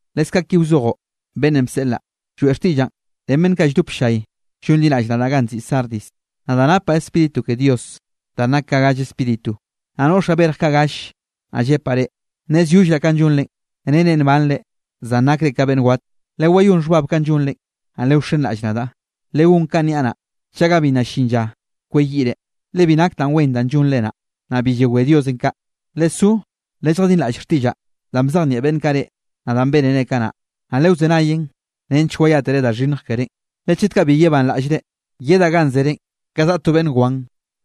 ’Leskaꞌ ki wzojoꞌ beꞌnnenꞌ bseꞌlaꞌ, lloeꞌ xtiꞌllaꞌn ren beꞌnn kaꞌ lldop ll-llay llonliraꞌll nadaꞌ ganꞌ nziꞌi Sardis: “Nadaꞌ napaꞌ Spíritu ke Dios danꞌ nak ka galle spíritu, naꞌ noꞌxaꞌ berj kaꞌ galle, naꞌ llepaꞌ reꞌ: Nnezyollraꞌ kanꞌ llonre nere nbanre, zan nakre ka beꞌnn wat. Lewayón xhbab kanꞌ llonre, naꞌ lewxenraꞌll-ll nadaꞌ, legón kanꞌ niaꞌ naꞌ, chaga bi nna llin lla kweyiꞌre, le bi nak danꞌ wen danꞌ llonre naꞌ, naꞌ bi yewé Diosenꞌ kaꞌ. Lesó lelljadinraꞌll xtiꞌllaꞌ danꞌ bzejnieꞌ beꞌnn kaꞌ reꞌ, naꞌ danꞌ bénere kanaꞌ. Naꞌ lewzenayen, nench wayátere da xhinnj kerénꞌ. Le chet kaꞌ bi yebanraꞌllre, yedaꞌ ganꞌ zerenꞌ ka zaꞌa to beꞌnn wan,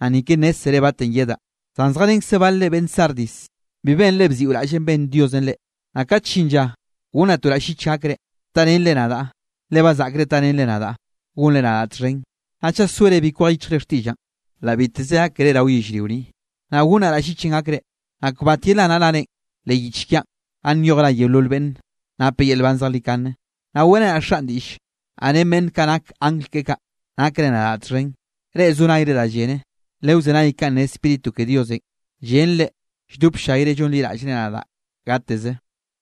naꞌ ni ke nnézzere batenꞌ yedaꞌ. Zan zjarenkze balre beꞌnn Sardis, bi benre bziꞌo raꞌllenꞌ benn Diosenꞌ reꞌ. Naꞌ kat llin lla gonnaꞌ to raꞌll llich gakre, tarenre nadaꞌ, le ba zaꞌkre tarenre nadaꞌ gonre nadaꞌ txhen. Naꞌ chaꞌ soere bi kwej yichjre xtiꞌllaꞌn, la biteze gak keré rao yellrio ni, naꞌ gonnaꞌ raꞌll llichenꞌ gakre, naꞌ kbat yelanaꞌ rarenꞌ leꞌ yich kiaꞌn ganꞌ nyoj ra yeolol beꞌnn nape yel nban zejlikane, naꞌ weꞌrenaꞌ Xaꞌn diꞌll, naꞌ ren beꞌnn kaꞌ nak angl keꞌe kaꞌ, nakre nadaꞌ txhen. Reꞌ zo nayre da llene, lewzenay kanꞌ ne Spíritu ke Diosenꞌ, llen reꞌ lldop ll-llayre llonliraꞌllre nadaꞌ gateze.”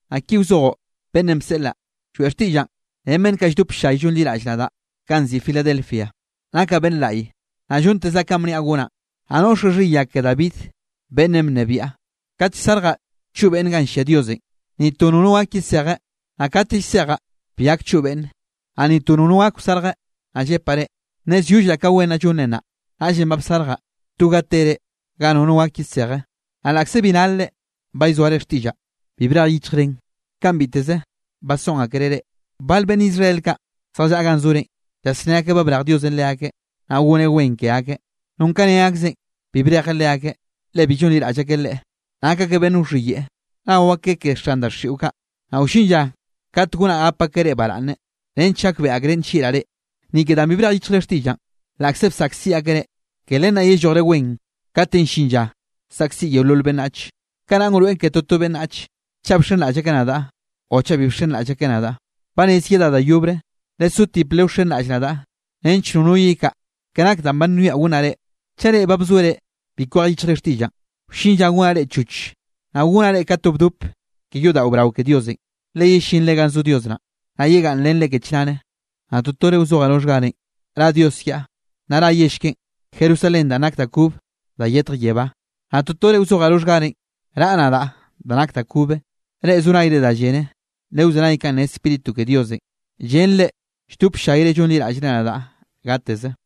’Naꞌ ki wzojoꞌ beꞌnnenꞌ bseꞌlaꞌ, lloeꞌ xtiꞌllaꞌn ren beꞌnn kaꞌ lldop ll-llay llonliraꞌll nadaꞌ ganꞌ nziꞌi Filadelfia: “Nakaꞌ Beꞌnn Laꞌy, naꞌ llontezaꞌ kanꞌ bniaꞌ gonaꞌn. Naꞌ noꞌxaꞌ xhiya ke da David beꞌnnenꞌ bnebiaꞌ. Kate llsarjaꞌ choꞌ beꞌnne ganꞌ llia Diosenꞌ, ni to nono gak yesejeꞌ, naꞌ kate llsejaꞌ, bi gak choꞌ beꞌnne, naꞌ ni to nono gak wsarje, naꞌ llepaꞌ reꞌ: Nnezyollraꞌ ka wen naꞌ llonre naꞌ, naꞌllenꞌ ba bsarjaꞌ to ga tere ga nono gak yeseje. Naꞌ laꞌkze bi nar-re, ba llzoare xtiꞌllaꞌ, bi brej yichjrenꞌ kanꞌ biteze basoꞌn akereꞌ reꞌ. Bal beꞌnn Israel kaꞌ zjallaꞌa ganꞌ zorenꞌ, llasné akeꞌ ba brej Diosenꞌ leakeꞌ, naꞌ goneꞌ wen ke akeꞌ. Non ka ne akzeꞌn, bi brejeꞌ leakeꞌ, le bi llonliraꞌll akeꞌ Leꞌe. Nak akeꞌ beꞌnn wxhiyeꞌe nao akeꞌ ke xan daxiꞌo kaꞌ. Naꞌ wllin lla kat gonaꞌ gap akeꞌ reꞌ baraꞌnne, nench gakbeꞌe akreꞌ nllieꞌraꞌ reꞌ. Ni ke danꞌ bi brej yichjre xtiꞌllaꞌn, laꞌkze bsaꞌkziꞌ akeꞌ reꞌ, ke len naꞌ yellojre wen kate llin lla saꞌkziꞌ yeolol beꞌnnach. Kanaꞌn wroeꞌn ke toto beꞌnnach, chaꞌ bxenraꞌll akeꞌ nadaꞌ o chaꞌ bi bxenraꞌll akeꞌ nadaꞌ. Ba rez yedaꞌ da yobre, lesotip lewxenraꞌll nadaꞌ nench nono yekaꞌa ke nak danꞌ ba nwiaꞌ gonnaꞌ reꞌ. Chaꞌ reꞌ ba bzoere bi kwej yichjre xtiꞌllaꞌn, wllin lla gonaꞌ reꞌ choch, naꞌ gonaꞌ reꞌ ka to bdop ke yodaꞌo brao ke Diosenꞌ, le yellinre ganꞌ zo Dios naꞌn, naꞌ yegaꞌnnrenreꞌ ke chnare. Naꞌ totore wzojaꞌ roxhgarenꞌ ra Dios kiaꞌ, naꞌ ra yell keꞌen, Jerusalén danꞌ nake da kobe da yetj yebá, naꞌ totore wzojaꞌ roxhgarenꞌ raꞌa nadaꞌ da nak da kobe. Reꞌ zo nayre da llene, lewzenay kanꞌ ne Spíritu ke Diosenꞌ, llen reꞌ lldop ll-llayre llonliraꞌllre nadaꞌ gateze.”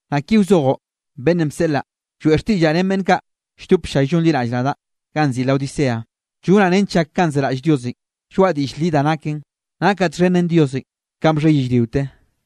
’Naꞌ ki wzojoꞌ beꞌnnenꞌ bseꞌlaꞌ, lloeꞌ xtiꞌllaꞌ ren beꞌnn kaꞌ lldop ll-llay llonliraꞌll nadaꞌ ganꞌ nziꞌi Laodicea: “Llonaꞌ nench llak kanꞌ zeraꞌll Diosenꞌ, lloaꞌa diꞌll li da naken. Nakaꞌ txhen ren Diosenꞌ kanꞌ bxhe yellriote,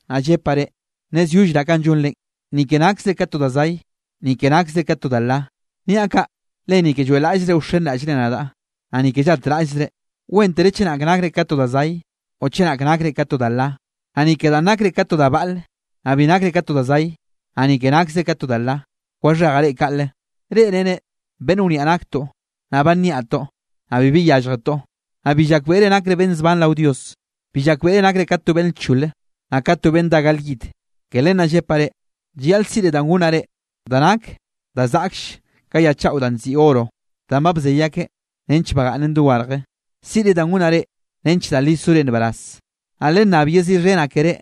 naꞌ llepaꞌ reꞌ: Nnezyollraꞌ kanꞌ llonrenꞌ, ni ke nakzre ka to da zay, ni ke nakzre ka to da la. Niaꞌ kaꞌ le ni ke lloeꞌlaꞌllzre wxenraꞌllre nadaꞌ, naꞌ ni ke llatraꞌllzre. Wéntere chenak nakre ka to da zay o chenak nakre ka to da la. Naꞌ ni ke danꞌ nakre ka to da baꞌl, naꞌ bi nakre ka to da zay, naꞌ ni ke nakzre ka to da la, waxhejaꞌ reꞌ kaꞌle. Reꞌ nere: Beꞌnn wniaꞌ naktoꞌ naꞌ ba nniaꞌtoꞌ, naꞌ bibi llyálljetoꞌ. Naꞌ bi llakbeꞌre nakre beꞌnn zban rao Dios. Bi llakbeꞌre nakre ka to beꞌnn lchole, naꞌ ka to beꞌnn dá gal yid. Ke len naꞌ llepaꞌ reꞌ, llayaꞌl siꞌre da gonnaꞌ reꞌ, da nak da zaꞌklle ka ya chaꞌo danꞌ nziꞌi oro danꞌ ba bzey akeꞌ nench bagaꞌnnen dogarje. Siꞌre da gonnaꞌ reꞌ, nench da li sore nbaraz. Naꞌ lennab yeziꞌxhenaꞌ keré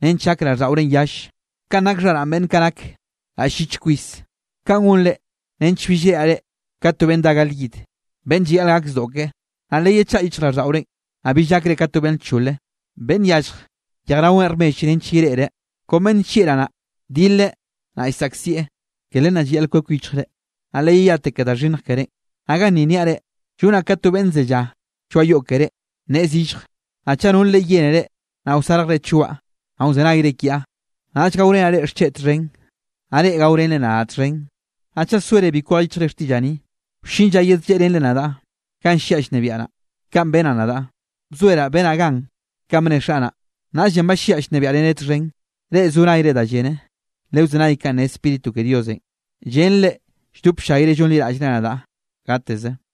nench gak raꞌlldaꞌorenꞌ yalle, kanꞌ nak xharaꞌn beꞌnn nak raꞌll llich kwis. Kaꞌn gonre nench bill reꞌraꞌ reꞌ ka to beꞌnn dá gal yid, beꞌnn llayaꞌl gake zdoꞌ ke. Naꞌ leyechaꞌa yichjraꞌlldaꞌorenꞌ, naꞌ bill gakre ka to beꞌnn lchole, beꞌnn yallj yejraweꞌn rmell nench yereꞌre. Kon beꞌnn nllieꞌraꞌ naꞌ, dileꞌ naꞌ llsaꞌkzieꞌ. Ke len naꞌ llayaꞌl kwek yichjre, naꞌ leyeyate ke da xhinnj kerénꞌ. Naꞌ ganni niaꞌ reꞌ, llonaꞌ ka to ke beꞌnn zellá lloaꞌ yoꞌ keré, nneꞌe zillje, naꞌ chaꞌ nol reꞌ yénere, naꞌ wsarjre choaꞌ, naꞌ wzenayre kiaꞌ, naꞌll gaorenaꞌ reꞌ xcheꞌ txhen, naꞌ reꞌ gaorenre nadaꞌ txhen. Naꞌ chaꞌ soere bi kwej yichjre xtiꞌllaꞌ ni, wllin lla yedlleꞌrenre nadaꞌ ganꞌ lliaꞌ llnebiaꞌ naꞌ. Kaꞌn benaꞌ nadaꞌ, bzoeraꞌ benaꞌ gan kanꞌ bne Xaꞌ naꞌ, naꞌllenꞌ ba lliaꞌ llnebiaꞌreneꞌ txhen. Reꞌ zo nayre da llene, lewzenay kanꞌ ne Spíritu ke Diosenꞌ, llen reꞌ lldop ll-llayre llonliraꞌllre nadaꞌ gateze.”